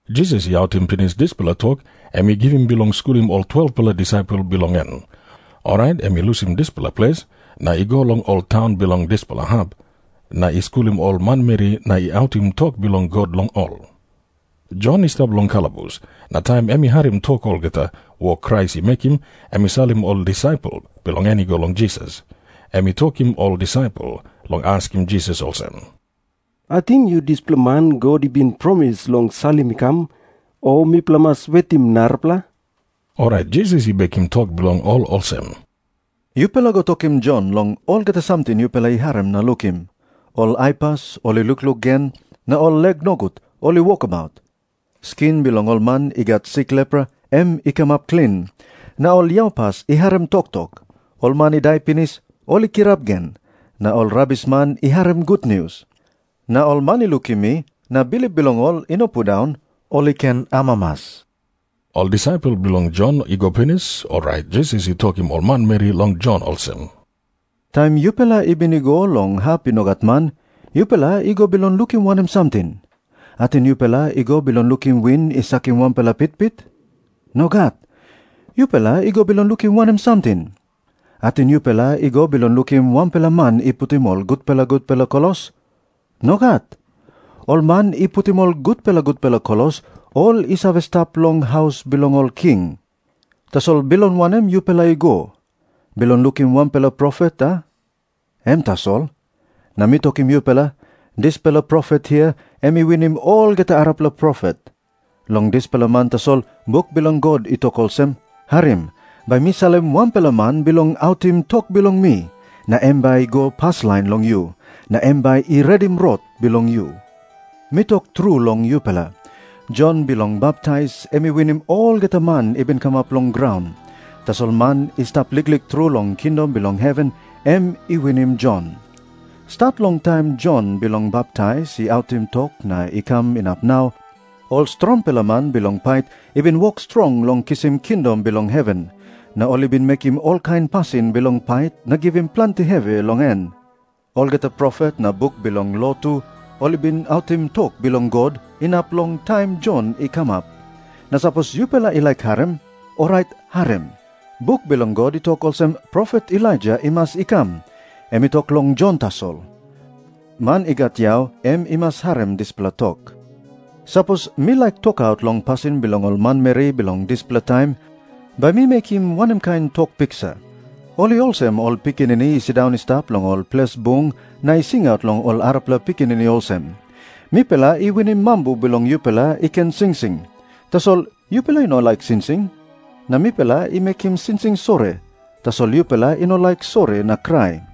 Jisas i autim pinis dispela tok em i givim bilong skulim ol 12-pela disaipel bilong en, orait em i lusim dispela ples na i go long ol taun bilong dispela hap na i skulim ol manmeri na i autim tok bilong God long ol. Jon i stap long kalabus, na taim em i harim tok long olgeta wok Krais i mekim, em i salim ol disaipel bilong en i go long Jisas. Em i tokim ol disaipel long askim Jisas olsem, “Ating yu dispela man God i bin promis long salim i kam, o mipela i mas wetim narapela?” Orait Jisas i bekim tok bilong ol olsem, “Yupela go tokim Jon long olgeta samting yupela i harim na lukim. Ol aipas ol i lukluk gen, na ol lek nogut ol i wokabaut. Skin bilong ol man i gat sik lepra, em i kamap klin, na ol yaupas i harim toktok. Ol man i dai pinis, ol i kirap gen, na ol rabisman i harim gutnius. Na ol man i lukim mi na bilip bilong ol i no pundaun, ol i ken amamas.” Ol disaipel bilong Jon i go pinis, orait Jisas i tokim ol manmeri long Jon olsem, “Taim yupela i bin i go long hap i no gat man, yupela i go bilong lukim wanem samting? Ating yupela i go bilong lukim win i sakim wanpela pitpit? Nogat. Yupela i go bilong lukim wanem samting? Ating yupela i go bilong lukim wanpela man i putim ol gutpela gutpela klos? Nogat. Ol man i putim ol gutpela gutpela klos, ol i save stap long haus bilong ol king. Tasol bilong wanem yupela i go? Bilong lukim wanpela profet, a? Em tasol. Na mi tokim yupela, dispela profet hia em i winim olgeta arapela profet. Long dispela man tasol buk bilong God i tok olsem, ‘Harim. Bai mi salim wanpela man bilong autim tok bilong mi, na em bai i go paslain long yu. Na em bai i redim rot bilong yu.’ Mi tok tru long yupela, Jon Bilong Baptais em i winim olgeta man i bin kamap long graun. Tasol man i stap liklik tru long kingdom bilong heven, em i winim Jon. “Stat long taim Jon Bilong Baptais i autim tok na i kam inap nau, ol strongpela man bilong pait i bin wok strong long kisim kingdom bilong heven, na ol i bin mekim olkain pasin bilong pait na givim planti hevi long en. Olgeta profet, na buk bilong lo tu, ol i bin autim tok bilong God inap long taim Jon i kamap. Na sapos yupela i laik harim, orait harim. Buk bilong God i tok olsem profet Elaija i mas i kam, em i tok long Jon tasol. Man i gat yau em i mas harim dispela tok. “Sapos mi laik tokaut long pasin bilong ol manmeri bilong dispela taim, bai mi mekim wanem kain tok piksa? Ol i olsem ol pikinini i sindaun i stap long ol ples bung na i singaut long ol arapela pikinini olsem, ‘Mipela i winim mambu bilong yupela i ken singsing, tasol yupela i no laik singsing. Na mipela i mekim singsing sori, tasol yupela i no laik sori na krai.’”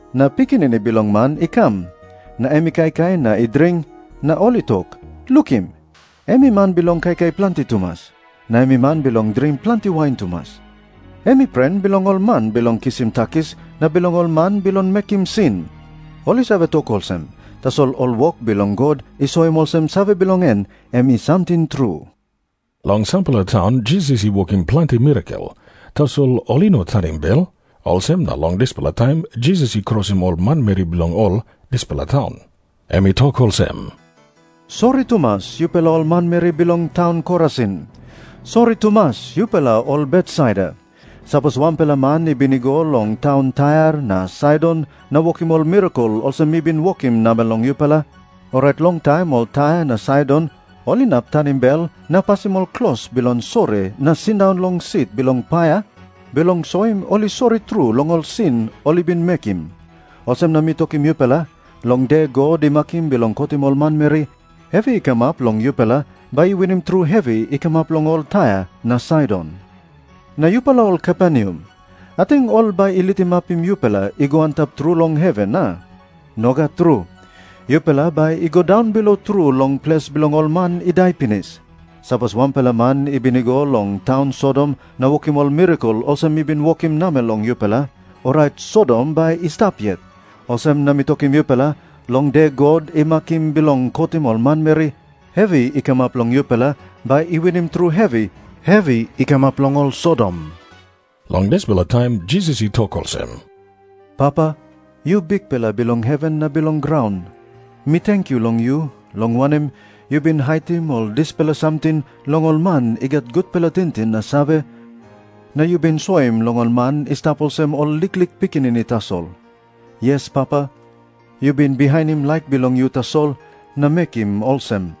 Na Pikinini Bilong Man i kam, na em i kaikai na i dring, na ol i tok, ‘Lukim, em i man bilong kaikai planti tumas, na em i man bilong dring planti wain tumas. Em i pren bilong ol man bilong kisim takis na bilong ol man bilong mekim sin.’ Ol i save tok olsem, tasol ol wok bilong God i soim olsem save bilong en em i samting tru.” Long sampela taun Jisas i wokim planti mirakel, tasol ol i no tanim bel. Olsem na long dispela taim Jisas i krosim ol manmeri bilong ol dispela taun. Em i tok olsem, “Sori tumas, yupela ol manmeri bilong taun Korasin. Sori tumas, yupela ol Betsaida. Sapos wanpela man i bin i go long taun Tair na Saidon na wokim ol mirakel olsem mi bin wokim namel long yupela, orait longtaim ol Tair na Saidon ol inap tanim bel na pasim ol klos bilong sori na sindaun long sit bilong paia, bilong soim ol i sori tru long ol sin ol i bin mekim. Olsem na mi tokim yupela, long de God i makim bilong kotim ol manmeri, hevi i kamap long yupela bai i winim tru hevi i kamap long ol Tair na Saidon. Na yupela ol Kaperneam, ating ol bai i litimapim yupela i go antap tru long heven, a? Nogat tru. Yupela bai i go daunbilo tru long ples bilong ol man i dai pinis. Sapos wanpela man i bin i go long taun Sodom na wokim ol mirakel olsem mi bin wokim namel long yupela, orait Sodom bai i stap yet. Olsem na mi tokim yupela, long de God i makim bilong kotim ol manmeri, hevi i kamap long yupela bai i winim tru hevi i kamap long ol Sodom.” Long dispela taim Jisas i tok olsem, “Papa, yu Bikpela bilong heven na bilong graun, mi tenkyu long yu, long wanem, yu bin haitim ol dispela samting long ol man i gat gutpela tingting na save, na yu bin soim long ol man i stap olsem ol liklik pikinini tasol. Yes, Papa, yu bin bihainim laik bilong yu tasol na mekim olsem.”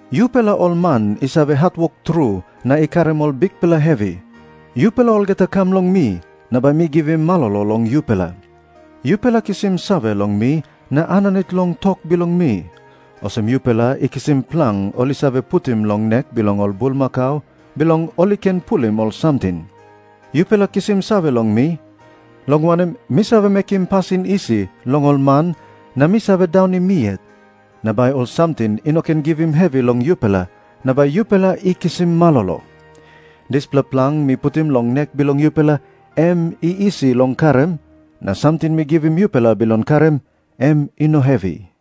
“Yupela ol man i save hatwok tru na i karim ol bikpela hevi, yupela olgeta kam long mi na bai mi givim malolo long yupela. Yupela kisim save long mi na aninit long tok bilong mi, olsem yupela i kisim plang ol i save putim long nek bilong ol bulmakau bilong ol i ken pulim ol samting. Yupela kisim save long mi, long wanem, mi save mekim pasin isi long ol man na mi save daunim mi yet. Na bai ol samting i no ken givim hevi long yupela na bai yupela i kisim malolo. Dispela plang mi putim long nek bilong yupela, em i isi long karim, na samting mi givim yupela bilong karim, em i no hevi.”